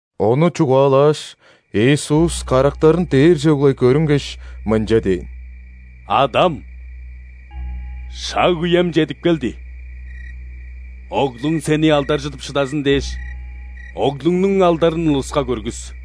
Ону чугаалааш, Иисус карактарын дээрже углай көрүнгеш, мынча дээн: «Адам! Шаг-үем чедип келди. Оглуң Сени алдаржыдып шыдазын дээш, Оглуңнуң алдарын улуска көргүс.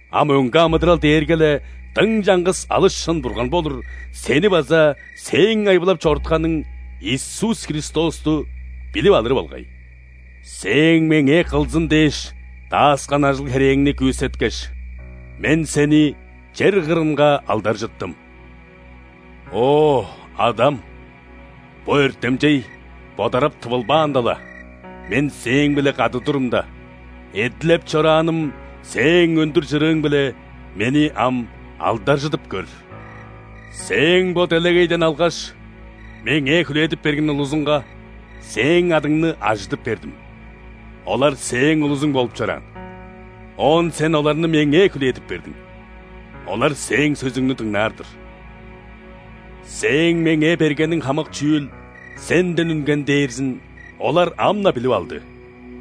А мөңге амыдырал дээрге-ле дың чаңгыс алыс шын Бурган болур Сени база Сээң айбылап чорутканың Иисус Христосту билип алыры болгай. Сээң Меңээ кылзын дээш дааскан ажыл-херээңни күүсеткеш, Мен Сени чер кырынга алдаржыттым. О, Адам, бо өртемчей бодарап тывылбаанда-ла, Мен Сээң-биле кады турумда, эдилеп чорааным Сээң өндүр чырыың-биле Мени ам алдаржыдып көр. Сээң бо делегейден алгаш, Меңээ хүлээдип берген улузуңга Сээң адыңны ажыдып бердим. Олар Сээң улузуң болуп чораан, оон Сен оларны Меңээ хүлээдип бердиң. Олар Сээң сөзүңнү дыңнаар-дыр. Сээң Меңээ бергениң хамык чүүл Сенден үнген дээрзин олар ам-на билип алды.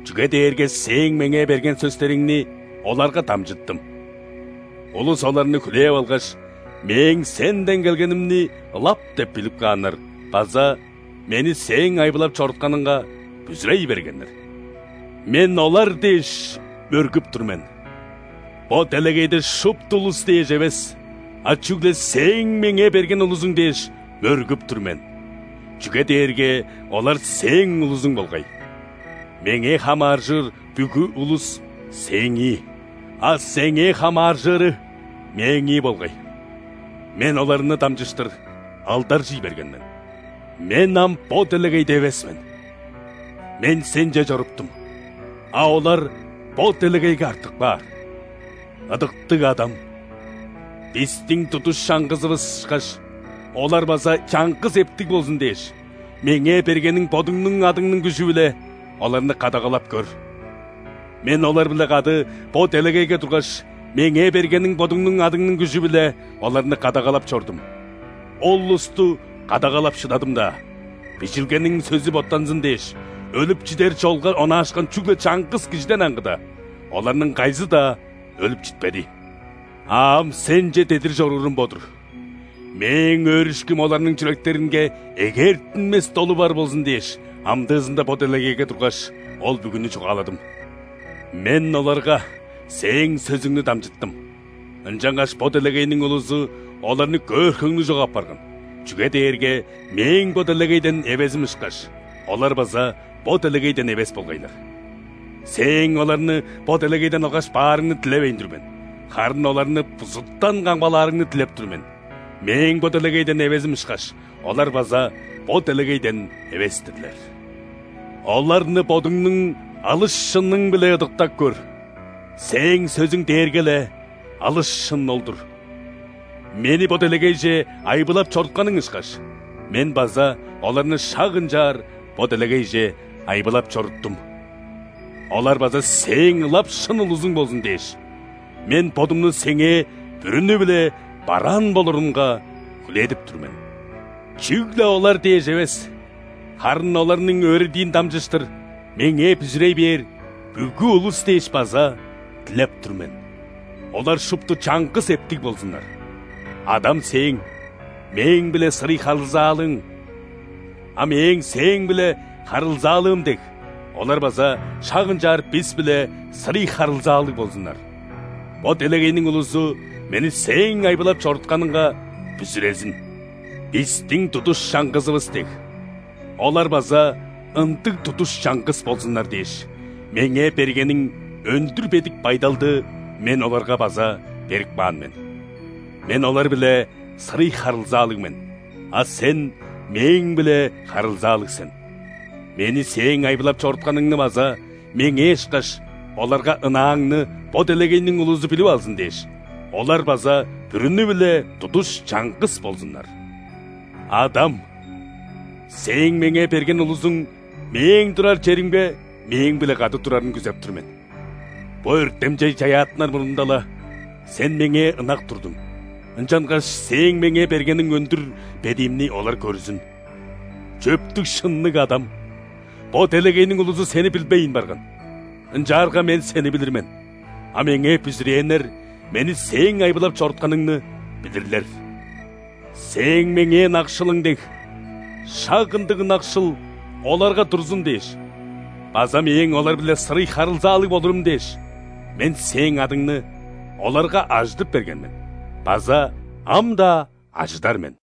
Чүге дээрге Сээң Меңээ берген сөстериңни оларга дамчыттым. Улус оларны хүлээп алгаш, Мээң Сенден келгенимни ылап деп билип кааннар база Мени Сээң айбылап чорутканыңга бүзүрей бергеннер. Мен олар дээш, мөргүп тур мен. Бо делегейде шупту улус дээш эвес, а чүгле Сээң Меңээ берген улузуң дээш, мөргүп тур мен, чүге дээрге олар Сээң улузуң болгай. Меңээ хамааржыр бүгү улус – Сээңии, а Сеңээ хамааржыры – Мээңии болгай. Мен оларны дамчыштыр алдаржый берген мен. Мен ам бо делегейде эвес мен, Мен Сенче чоруптум, а олар бо делегейге артып каар. Ыдыктыг Адам! Бистиң тудуш чаңгызывыс ышкаш, олар база чаңгыс эптиг болзун дээш, Меңээ бергениң Бодуңнуң адыңның күжү-биле оларны кадагалап көр. Мен олар-биле кады бо делегейге тургаш, Меңээ бергениң Бодуңнуң адыңның күжү-биле оларны кадагалап чордум. Ол улусту кадагалап шыдадым-даа: Бижилгениң сөзү боттанзын дээш, өлүп чидер чолга онаашкан чүгле чаңгыс кижиден аңгыда, оларның кайызы-даа өлүп читпеди. А ам Сенче дедир чоруурум бо-дур. Мээң өөрүшкүм оларның чүректеринге эгээртинмес долу бар болзун дээш, амдыызында бо делегейге тургаш, ол бүгүнү чугааладым. Мен оларга Сээң сөзүңнү дамчыттым, ынчангаш бо делегейниң улузу оларны көөр хөңнү чок апарган, чүге дээрге Мээң бо делегейден эвезим ышкаш, олар база бо делегейден эвес болгайлар. Сээң оларны бо делегейден алгаш баарыңны дилевейн тур мен, харын оларны бузуттан камгалаарыңны дилеп тур мен. Мээң бо делегейден эвезим ышкаш, олар база бо делегейден эвес-тирлер. Оларны Бодуңнуң алыс шының-биле ыдыктап көр: Сээң сөзүң дээрге-ле алыс шын ол-дур. Мени бо делегейже айбылап чорутканың ышкаш, Мен база оларны шак ынчаар бо делегейже айбылап чоруттум. Олар база Сээң ылап шын улузуң болзун дээш, Мен Бодумну Сеңээ бүрүнү-биле бараан болурунга хүлээдип тур мен. Чүгле олар дээш эвес, харын оларның өөредиин дамчыштыр Меңээ бүзүрей бээр бүгү улус дээш база дилеп тур мен. Олар шупту чаңгыс эптиг болзуннар: Адам Сээң – Мээң-биле сырый харылзаалыың, а Мээң – Сээң-биле харылзаалыым дег, олар база шак ынчаар Бис-биле сырый харылзаалыг болзуннар. Бо делегейниң улузу Мени Сээң айбылап чорутканыңга бүзүрезин. Бистиң тудуш чаңгызывыс дег, олар база ындыг тудуш чаңгыс болзуннар дээш, Меңээ бергениң өндүр бедик байдалды Мен оларга база берип каан мен. Мен – олар-биле сырый харылзаалыг мен, а Сен – Мээң-биле харылзаалыг сен. Мени Сээң айбылап чорутканыңны база, Меңээ ышкаш, оларга ынааңны бо делегейниң улузу билип алзын дээш, олар база бүрүнү-биле тудуш чаңгыс болзуннар! Адам! Сээң Меңээ берген улузуң Мээң турар черимге Мээң-биле кады турарын күзеп тур мен. Бо өртемчей чаяаттынар мурнунда-ла, Сен Меңээ ынак турдуң, ынчангаш Сээң Меңээ бергениң өндүр бедиимни олар көрзүн. Чөптүг-шынныг Адам! Бо делегейниң улузу Сени билбейн барган. Ынчаарга Мен Сени билир мен, а Меңээ бүзүрээннер Мени Сээң айбылап чорутканыңны билирлер. Сээң Меңээ ынакшылың дег, шак ындыг ынакшыл оларга турзун дээш база Мээң олар-биле сырый харылзаалыг болурум дээш, Мен Сээң адыңны оларга ажыдып берген мен база ам-даа ажыдар мен».